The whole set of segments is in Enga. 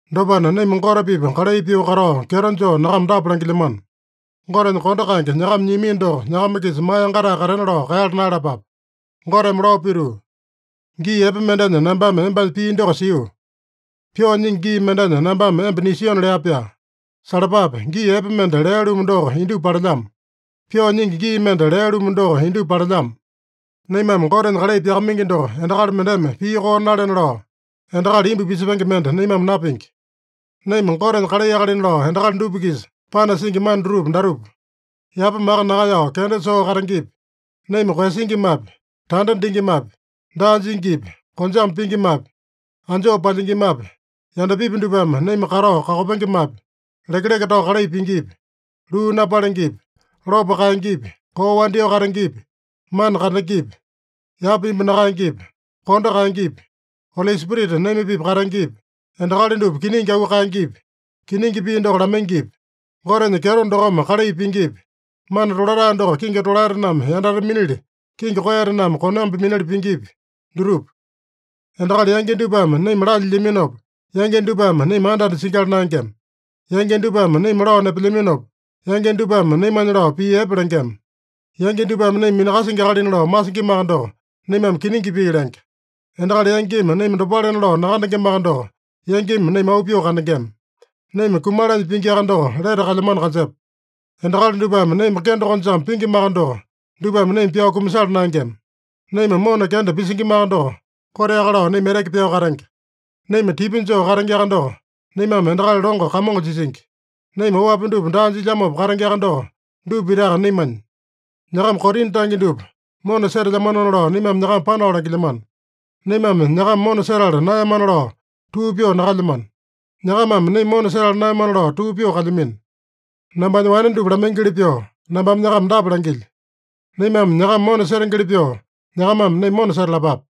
Dopana, naima Gote-pipa kalai pyoo katao kyeto joo nyakama dapa langilyamano: Gotenya kondo kaenge nyakama nyiamino doko nyakama-kisa maa yangatae katena lao kaeyala naeyalapape. Goteme lao pituu, “Gii epe mendenya nambame embanya pii doko sio. Pyoo nyingi gii mendenya nambame emba nisiona” lea-pyaa. Salapape! Gii epe mende lea-lumu doko indupa palelyamo. Pyoo nyingi gii mende lea-lumu doko indupa palelyamo. Naimame Gotenya kalai pyakamaingi doko endakali mendeme pii koo nalena lao, endakali imbu pisepenge mende naimame napingi. Naima Gotenya kalai akalina lao endakali dupa-kisa panasingi mana dutupa datupa: Yapa maka nakaeyao kenda dupa soo katengepi, naima koeyasingimapi, tanda dingimapi, daa jingipi, konjame pingimapi, anjoo palyingimapi, yandapipi dupame naima katao kakopengemapi, lekeleke tao kalai pingipi, luu napalengepi, lopo kaengepi, koo wandyoo katengepi, mana kandengepi, yapa imbu nakaengepi, kondo kaengepi, Oli Spirita naima-pipa katengepi, endakali dupa kiningi auu kaengepi, kiningi pii doko lamaingipi, Gotenya kyeto dokome kalai pingipi, mana tolatae doko kingi tolaetename yandate minili, kingi koeyatename konambi minili pingipi, dutupa. Endakali yangi dupame naima lalyilyaminopa, yangi dupame naima anda-anda singyala naengema. Yangi dupame naima lao nepelyaminopa, yangi dupame naimanya lao pii epe lengema. Yangi dupame naima minakasingi akalina lao masingimaka doko, naimame kiningi pii lenge. Endakali yangimi naima dopalena lao nakandengemaka doko, yangimi naima auu pyoo kandengema. Naima kumalanya pingiaka doko, lete kalyamano kanjepa. Endakali dupame naima kende konjame pingimaka doko, dupame naima pyao kumasala naengema. Naima mona kenda pisingimaka doko, koteaka lao naima eteke pyao katenge. Naima tipya joo katengeaka doko, naimame endakali longo kamongo jisingi. Naima oapi dupa daa jilyamopa katengeaka doko, dupa pitaka naimanya. Nyakama Korina tange dupa mona setelyamanona lao naimame nyakama panao langilyamano. Naimame nyakama mona setala naeyamana lao tuu pyoo nakalyamano. Nyakamame naima mona setala naeyamana lao tuu pyoo kalyamino. Nambanya wane dupa lamaingili pyoo, nambame nyakama dapa langilyo: Naimame nyakama mona setengeli pyoo nyakamame naima mona setalapape.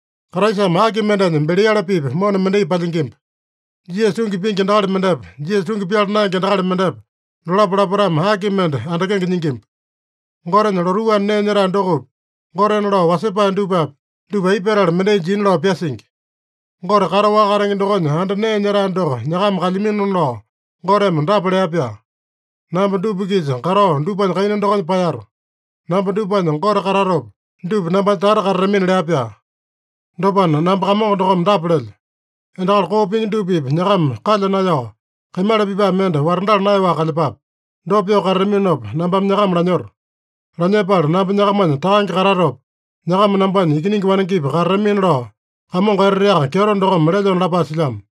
Kraisame aki mendenya Beliale-pipa mona mendai palyingimba? Jisasa tungi pingi endakali mendepa, Jisasa tungi pyala naenge endakali mendepa, dolapo lapotame aki mende andakenge nyingimba? Gotenya lotuu anda nee nyetae dokopi, gotena lao wasepae dupapi, dupa aipa petala mendai jina lao pyasingi? Gote kataowaka katenge dokonya anda nee nyetae doko nyakama kalyaminona lao Goteme dapa lea-pyaa: “Namba dupa-kisa katao dupanya kaina dokonya paeyato. Namba dupanya Gote katatopa, dupa nambanya tata katatamina” lea-pyaa. Dopana, “Namba Kamongo dokome dapa lelyo: ‘Endakali koo pingi dupa-pipa nyakama kalya naeyao, kaimala pipae mende watandala naeyaowaka kalyepape. Dopa pyoo katataminopa, nambame nyakama lanyoto. Lanyepala namba nyakamanya takange katatopa, nyakama nambanya ikiningi wanengepi katatamina’ lao Kamongo Eteteaka Kyeto dokome lelyona” lapae silyamo.